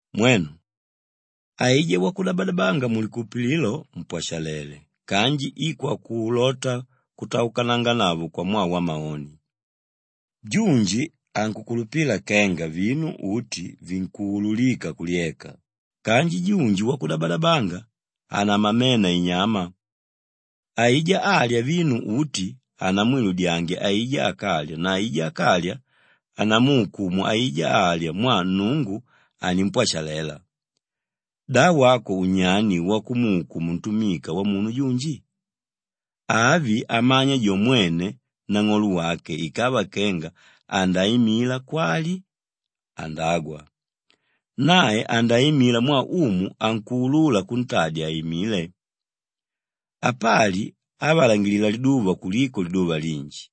Mwenu, aijá wakudabadabanga mulikulupililo mpwashalele kanji i kwakulota kutaukananganavo kwamwaa wamaoni. Junji ankukulupila kenga vinu uti vinkuululika kulyeka kanji junji wakudabadabanga, hanamamena inyama. Aijá álya vinu uti hanamwiludyange aijá ákalya na aijá ákalya, hanamuukumu aijá álya mwaa Nnungu animpwashalela. Da wako unyani wakumuukumu ntumika wamunu junji? Avi amanya jo mwene nang'olo wake ikava kenga andaimila kwali andagwa. Nae andaimila mwaa Umu ankuulula kuntadya aimile. Apali ávalangilila liduva kuliko liduva linji,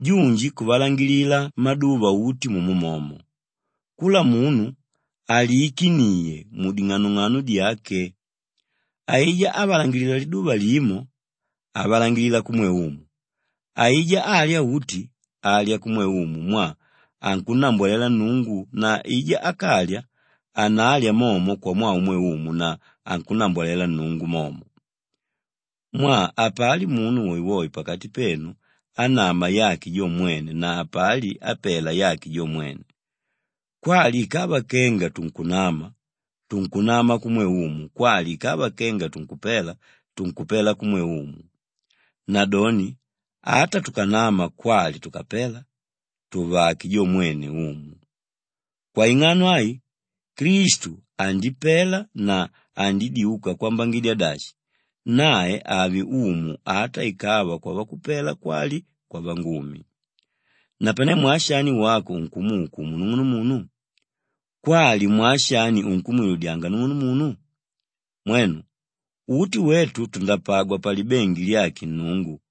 junji kuvalangilila maduva uti mumo momo. Kula munu aliikiniye muding'anong'ano dyake. Aijá ávalangilila liduva limo, avalangilila kumwe Umu. Aijá álya uti, alya kumwe Umu mwaa ankunnambwalela Nnungu na aijá ákalya, hanalya momo kwamwaa umwe Umu na ankunnambwalela Nnungu momo. Mwaa hapali munu woewoe pakati petu ánama yake jo mwene na hapali ápela yake jo mwene. Kwali ikava kenga tunkunama, tunkunama kumwe Umu kwali ikava kenga tunkupela, tunkupela kumwe Umu. Nadoni ata tukanama kwali tukapela, tùvake jo mwene Umu. Kwaing'ano ai, Klistu andipela na andidyuka kwambangidya dashi, nae ave Umu ata ikava kwavakupela kwali kwavangumi. Napane mwaa shani wako unkumuukumu nung'unumunu? Kwali mwaa shani unkumwiludyanga nung'unumunu? Mwenu, uti wetu tundapagwa palibengi lyake Nnungu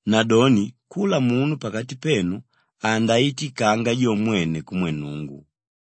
Nadoni kula munu pakati petu andaitikanga jo mwene kumwe Nnungu.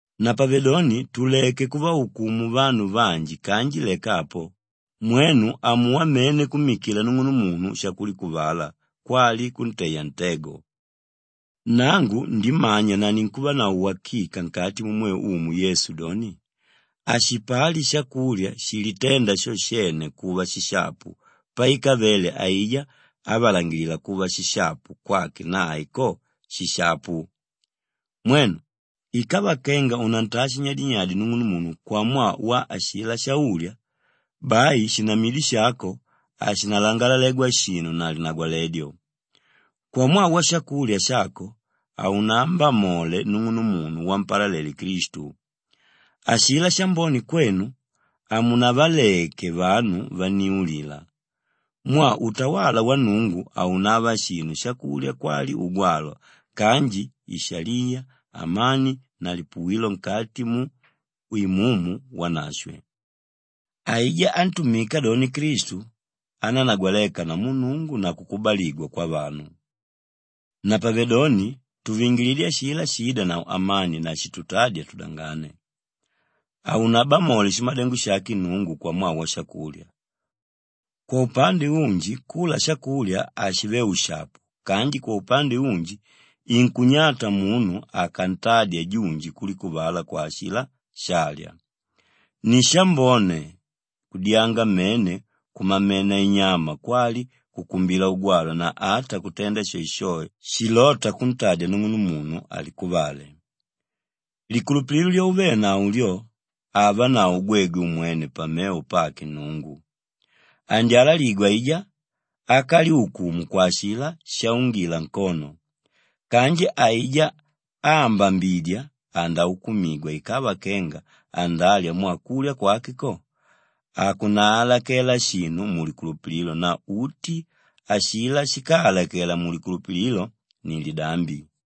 Napavedoni tuleke kuvaukumu vanu vanji kanji leka apo, mwenu amuwa mene kummikila nung'unumunu shakulikuvala kwali kunteya ntego. Nangu ndimanya na ninkuvanavo wakika nkati mumwe Umu Yesu doni, hashipali shakulya shiliténda sho shene kuva shishapu paikavele aijá ávalangila kuva shishapu kwake nae ko, shishapu. Mwenu, ikava kenga unantaa shinyadinyadi nung'unumunu kwamwaa wa ashilá sháulya, bai shinamidyo shako hashinalangalalegwa shinu na linagwaledyo. Kwamwaa washakulya shako, haunambamole nung'unumunu wampalalele Klistu. Ashilá shambone kwenu, hamunavaleke vanu vanniulila. Mwaa utawala wa Nnungu haunava shinu shakulya kwali ugwalwa kanji ishaliya, amani na lipuwilo nkati mu Imumu Wanashwe. Aijá ántumika doni Klistu, anánagwaleka namu Nnungu na kukubaligwa kwavanu. Napavedoni tuvingilidye ashilá shiídanavo amani na shitutádya tudangane. Haunabamole shimadengo shake Nnungu kwamwaa washakulya. Kwaupande unji kula shakulya hashive ushapu kanji kwaupande unji inkunyata munu akantadya junji kulikuvala kwa ashilá shálya. Ni shambone kudyanga mene kumamena inyama kwali kukumbila ugwalwa na ata kutenda shoeshoe shilóta kuntadya nung'unumunu alikuvale. Likulupililo lyauvenavo lyo avanavo gwegwe umwene pamevo pake Nnungu. Andyalaligwa aijá ákalyukumu kwa ashilá shaungila nkono. Kanji aijá áambambidya, andaukumigwa ikava kenga andalya mwaa kulya kwake ko, hakunaalakela shinu mulikulupililo na uti ashilá shíkaalakela mulikulupililo ni lidambi.